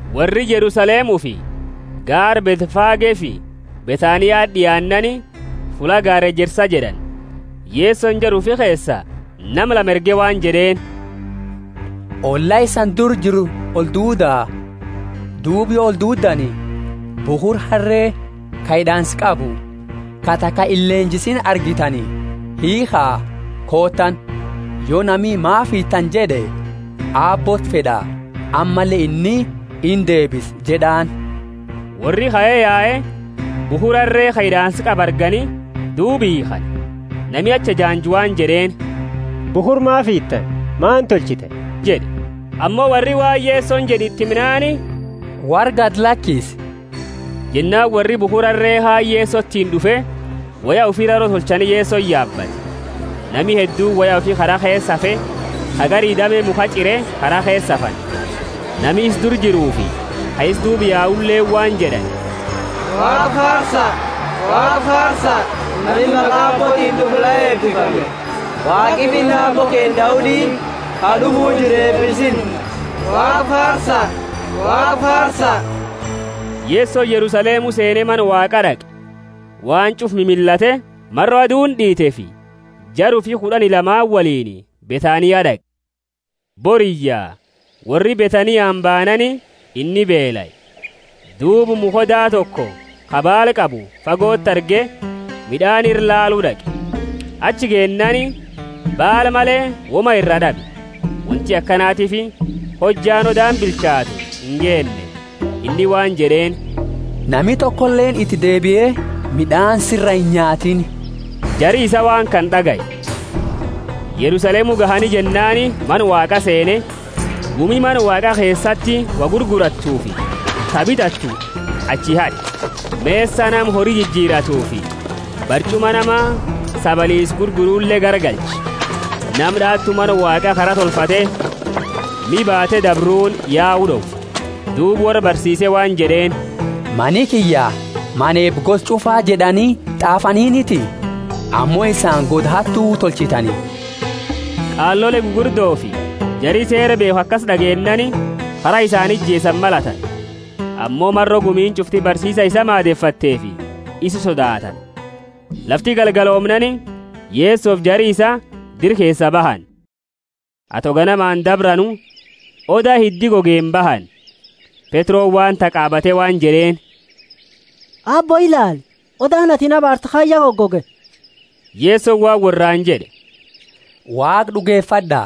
Worri Yerusalemufi gaara Bethfagefi Bethaniati d'iaannaani, fulla gaara Ejersa jed'ani, Yesoni jara ufi keesa nama lama erge waan jed'eeni, Olla isani dura jiru olduuda, duuba yo olduuddani, bukhura harree, ka hid'aansa qabu, ka taka illenjisiini argitani, hiikha, kootaani. Yo nami, Maafi hiitani? jed'e, Aabbooti fed'a, ammalle inni indeebisa jed'aani. Worri kae yae, bukhura harre, ka hid'aansa qabu argani, duuba hiikhani. Nami achi ejaanju waan jed'eeni, Bukhura maafi hiitani, maani tolchitani? jed'e. Ammo worri waan Yesoni jed'e, iti himnaani, worra gadi lakise. Jennaani worri bukhura harree kaani Yesotiini d'ufe woya ufi raro tolchani Yesoni yaabate. Nami hedduuni woya ufi kara keesa afe, ka gari dame mukha ch'ire, kara keesa afani. Nami isa dura jiruufi ka isa duuba yauleeni waan jed'ani, Waaqa faarsa, Nami maqa Aabbootiini d'ufu la eebifame! Waaqi finna Aabbo keenna Daudi, ka d'ufu jiru eebisinna! Waaqa faarsa! Yesoni Yerusalemu seene Mana Waaqa d'aqe. Waan ch'ufa mimillate, maro aduuni d'iiteefi, jara ufi kud'ani lamaani woliini Bethania d'aqe. Boriyya, worri Bethaniani baanaani, inni beelae. Duuba mukha oda toko, ka baala qabu, fagoti arge, mid'aani ira laalu d'aqe. Achi geennaani, baala male, woma iraa d'abe; wonti akanatiifi hojjaani odaani bilchaatu ingeenne. Inni waan jed'eeni, Nami tokoleeni iti deebie mid'aani sira inyaatini! Jari isaa waan kana d'agaye. Yerusalemu gahani jennaani Mana Waaqa seene, gumi Mana Waaqa keesati wo gurgurattufi ta bitattu achi had'e, mesa nama hori jijiratufi barch'uma nama sabaliisa gurgurule garagalche, nama d'aatu Mana Waaqa kara tolfate miha baate dabruuni yau d'owe. Duuba worra barsiise waan jed'eeni, Mani kiyya mana eeba gosa ch'ufa jed'ani t'aafaniiniti? Ammo isani goda hattu tolchitani. Qaalole gugurdofi jari Seera beekhu akasi d'ageennaani kara isaani ijeesani malatani. Ammo maro gumiini ch'ufti barsiisa isaa maadefatteefi isa sodaatani. Lafti galgaloomnaani, Yesofi jari isaa dira keesaa bahani. Ato ganamaani dabranu, oda hiddi gogeeni bahani. Petroni waan tahe qaabate waan jed'eeni, Aabbo, ilaali, odaani atini abaarte kaani ya gogoge. Yesoni waan worraani jed'e, Waaqa d'ugefad'a.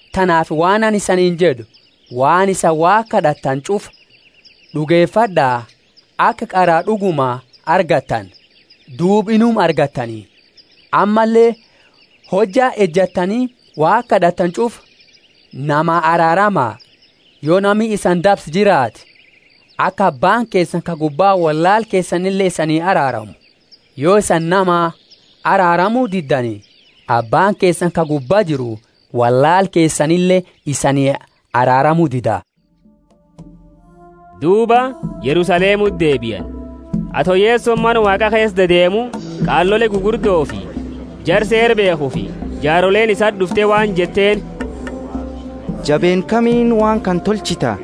Tanaafi waan anini isaniini jed'u, Waan isani Waaqa kad'attani ch'ufa, d'ugefad'a, aka qara d'uguma argattani, duuba inuma argattani. Ammalle, hojja ejattani Waaqa kad'attani ch'ufa, namaa araarama, yo nami isani dabse jiraate, aka Abbaani keesani ka gubba wollaala keesanile isanii araaramu. [ Yo isani namaa araaramu diddani, Abbaani keesani ka gubbaa jiru wollaala keesanile isanii araaramu dida.] Duuba Yerusalemuti deebiani. Ato Yesoni Mana Waaqa keesa deedeemu qaalole gugurdofi jara Seera beekhufi jaaroleeni isati d'ufte waan jetteeni, Jabeenna kamiini waan kana tolchita?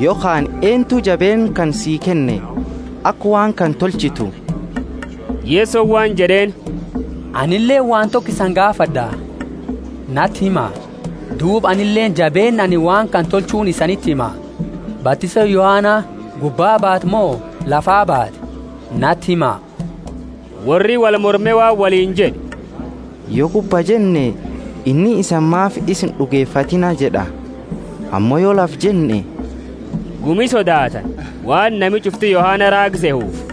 Yokhaani, eentu jabeenna kana sii kenne, aka waan kana tolchitu? Yesoni waan jed'eeni, Anileeni waan toko isani gaafad'a; nati hima, duuba anileeni jabeenna anini waan kana tolchuuni isaniti hima. Batisooni Yohana gubbaa baate mo lafaa baate? Nati hima. Worri wolmorme waan woliini jed'e, Yo gubbaa jenne, inni, Isani maafi isa ind'ugefatiina? jed'a. Ammo yo Lafaa jenne (gumi sodaatani, waan nami ch'ufti Yohana raaga sehuufi).